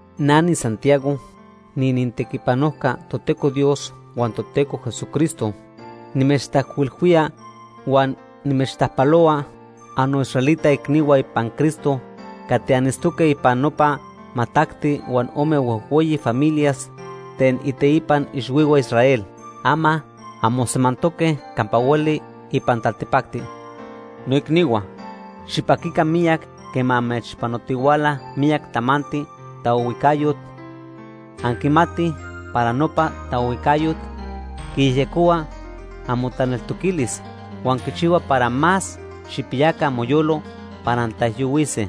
Na niSantiago, niinintequipanojca Toteco Dios huan Toteco Jesucristo. Nimechtajcuilhuía huan nimechtajpalohua annoisraelita icnihua ipan Cristo cati anitztoque ipan nopa majtacti huan ome huejhueyi familias ten iteipan ixhuihua Israel. Ama anmosemantoque campa hueli ipan taltipacti. Noicnihua, xipaquica miyac quema amechpanotihuala miyac tamanti taohuijcayot. Anquimatij para nopa taohuijcayot quiyejyecohua amotaneltoquilis huan quichihua para más xijpiyaca amoyolo para antaijyohuise.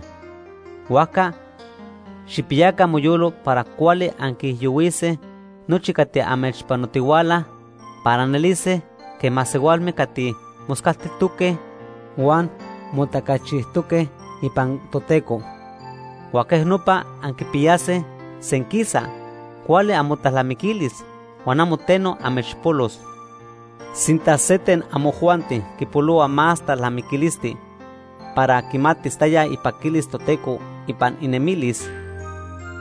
Huajca xijpiyaca amoyolo para cuali anquiijyohuise nochi cati amechpanotihuala para anelise quej masehualme cati moscaltijtoque huan motacachijtoque ipan Toteco. Huan quej nopa anquipiyase senquisa cuali amotalnamiquilis huan amo teno amechpolos. Sinta se ten amojuanti quipolohua más talnamiquilisti para quimatis taya ipaquilis Toteco ipan inemilis,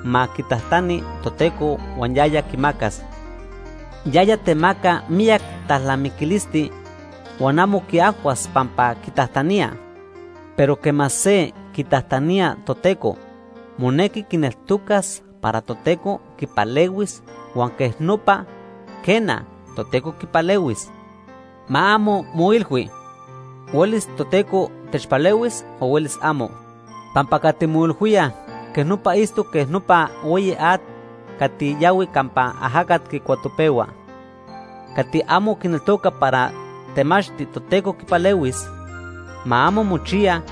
ma quitajtani Toteco huan yaya quimacas. Yaya temaca miyac talnamiquilisti huan amo quiajhuas pampa quitajtanía. Pero quema se quitajtanía Toteco, monequi quineltocas para Toteco quipalehuis huan quej nopa, quena, Toteco quipalehuis. Ma amo moilhui: Huelis Toteco techpalehuis o huelis amo. Pampa cati moilhuía quej nopa itztoc quej nopa hueyi at cati yahui campa ajacat quicuatopehua. Cati amo quineltoca para temachti Toteco quipalehuis, ma amo mochiya,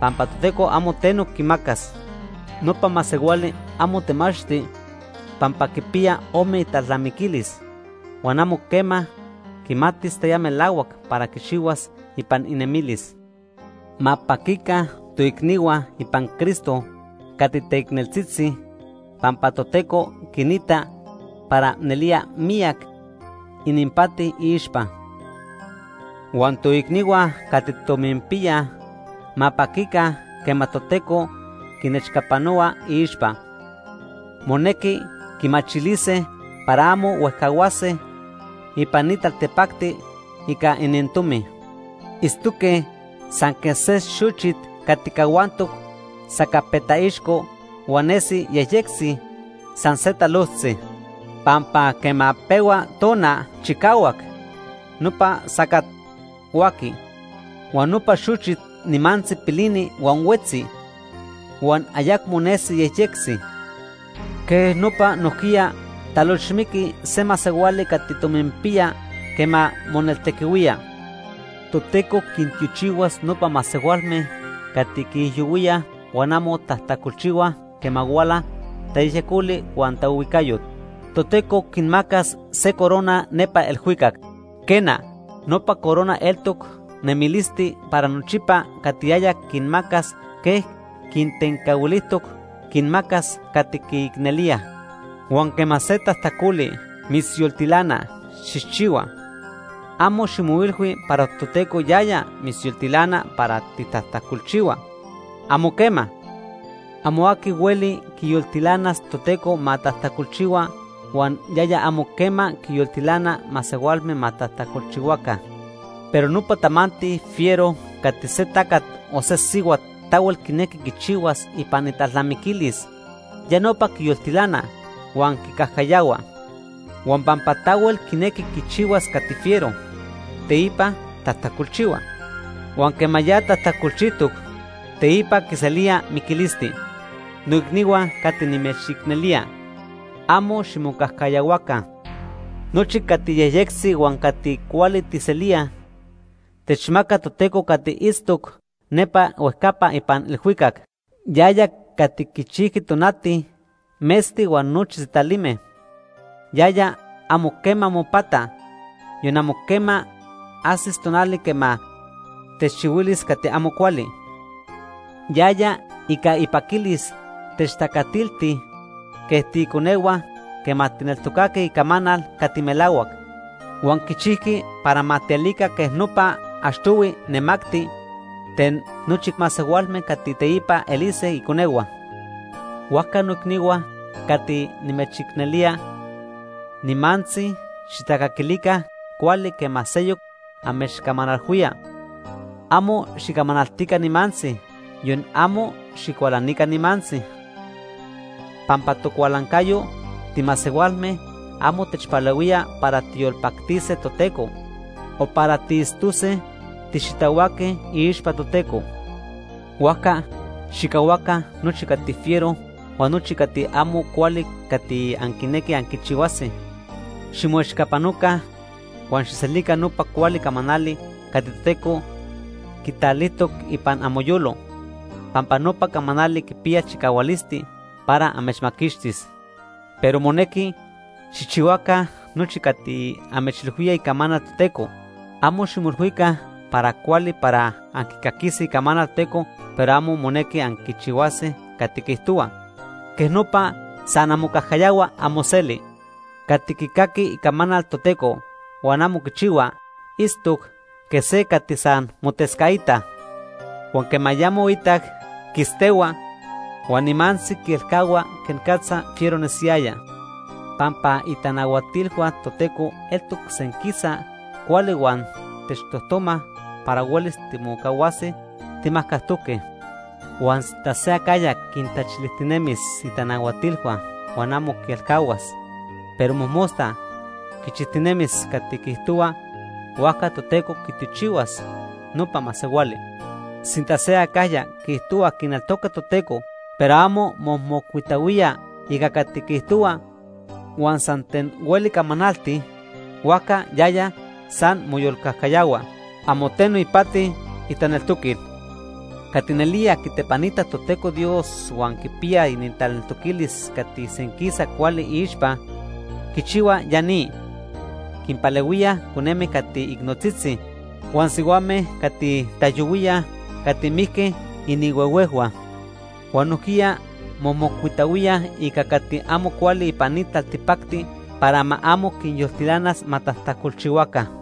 pampa Toteco amo teno quimacas. Nopa masehuali amo temachti pampa quipiya ome italnamiquilis, huan amo quema quimatis taya melahuac para quichihuas ipan inemilis. Ma paquica toicnihua ipan Cristo cati teicneltzitzi pampa Toteco quinita para nelía miyac ininpati iixpa. Huan toicnihua cati tominpiyaj ma paquica quema Toteco quinechcapanohua iixpa. Monequi quimachilise para amo huejcahuase ipan ni taltipacti ica inintomi. Itztoque san quej se xochit cati cahuantoc sacapetaixco huan nesi yejyectzi san se talojtzi. Pampa quema pehua tona chicahuac, nopa sacat huaqui. Huan nopa xochit nimantzi pilini huan huetzi, huan ayecmo nesi yejyectzi. Quej nopa nojquiya talochmiqui se masehuali cati tominpiya quema moneltequihuía. Toteco quintiochihuas nopa masehualme cati quiijyohuíaj huan amo tajtacolchihuaj quema huala tayejyecoli huan taohuijcayot. Toteco quinmacas se corona nepa ilhuicac. Quena, nopa corona eltoc nemilisti para nochipa cati yaya quinmacas quej quintencahuilijtoc quinmacas cati quiicnelíaj. Huan quema se tajtacoli mitzyoltilana xijchihua, amo ximoilhui para Toteco yaya mitzyoltilana para xitajtacolchihua. ¡Amo quema! Amo aqui hueli quiyoltilanas Toteco ma tajtacolchihua huan yaya amo quema quinyoltilana masehualme ma tajtacolchihuaca. Pero nopa tamanti fiero cati se tacat o se sihuat tahuel quinequi quichihuas ipan italnamiquilis, ya nopa quiyoltilana huan quicajcayahua. Huan pampa tahuel quinequi quichihuas cati fiero, teipa tajtacolchihua. Huan quema ya tajtacolchijtoc, teipa quiselía miquilisti. Noicnihua cati nimechicnelía. Amo ximocajcayahuaca. Nochi cati yejyectzi huan cati cuali tijselíaj, techmaca Toteco cati itztoc nepa huejcapa ipan ilhuicac. Yaya cati quichijqui tonati, metzti huan nochi sitalime. Yaya amo quema mopata. Yon amo quema ajsis tonali quema techchihuilis cati amo cuali. Yaya ica ipaquilis techtacatilti quej tiiconehua quema tijneltocaque icamanal cati melahuac. Huan quichijqui para ma tielica quej nopa achtohui nemacti ten nochi masehualme cati teipa elise iconehua. Huajca noicnihua cati nimechicnelía, nimantzi xijtacaquilica cuali quema seyoc amechcamanalhuía. Amo xicamanaltica nimantzi yon amo xicualanica nimantzi. Pampa tocualancayo timasehualme amo techpalehuía para tijyolpactise Toteco, o para tiitztose tixitahuaque iixpa Toteco. Huajca xijcahuaca nochi cati fiero huan nochi cati amo cuali cati anquinequij anquichihuase. Ximoechcapanoca huan xijselica nopa cuali camanali cati Toteco quitalijtoc ipan amoyolo, pampa nopa camanali quipiya chicahualisti para amechmaquixtis. Pero monequi xijchihuaca nochi cati amechilhuía icamanal Toteco. Amo ximoilhuica para cuali para anquicaquise Icamanal Toteco pero amo monequi anquichihuase cati quiijtohua. Quej nopa san anmocajcayahuaj amoselti. Cati quicaqui Icamanal Toteco huan amo quichihua, itztoc quej se cati san motescaita, huan quema ya moitac, quistehua, huan nimantzi quielcahua quenicatza fiero nesiyaya. Pampa itanahuatilhua Toteco eltoc senquisa cuali huan techtojtomaj para huelis timocahuase timajcajtoque. Huan sinta se acajya quintachilijtinemis itanahuatilhua huan amo quielcahuas, pero mojmosta quichijtinemis cati quiijtohuaj, huajca Toteco quitiochihuas nopa masehuali. Sinta se acajya quiijtohua quineltoca Toteco, pero amo momocuitahuía ica cati quiijtohua; huan san ten hueli camanalti, huajca yaya san moyolcajcayahua. Amo teno ipati itaneltoquil. Cati nelía quitepanitaj Toteco Dios huan quipiyaj inintaneltoquilis cati senquisa cuali iixpa, quichihuaj ya ni: quinpalehuíaj coneme cati icnotzitzi, huan sihuame cati taijyohuíaj cati mijque inihuehuejhua, huan nojquiya momocuitahuíaj ica cati amo cuali ipan ni taltipacti para ma amo quinyoltilanas ma tajtacolchihuaca.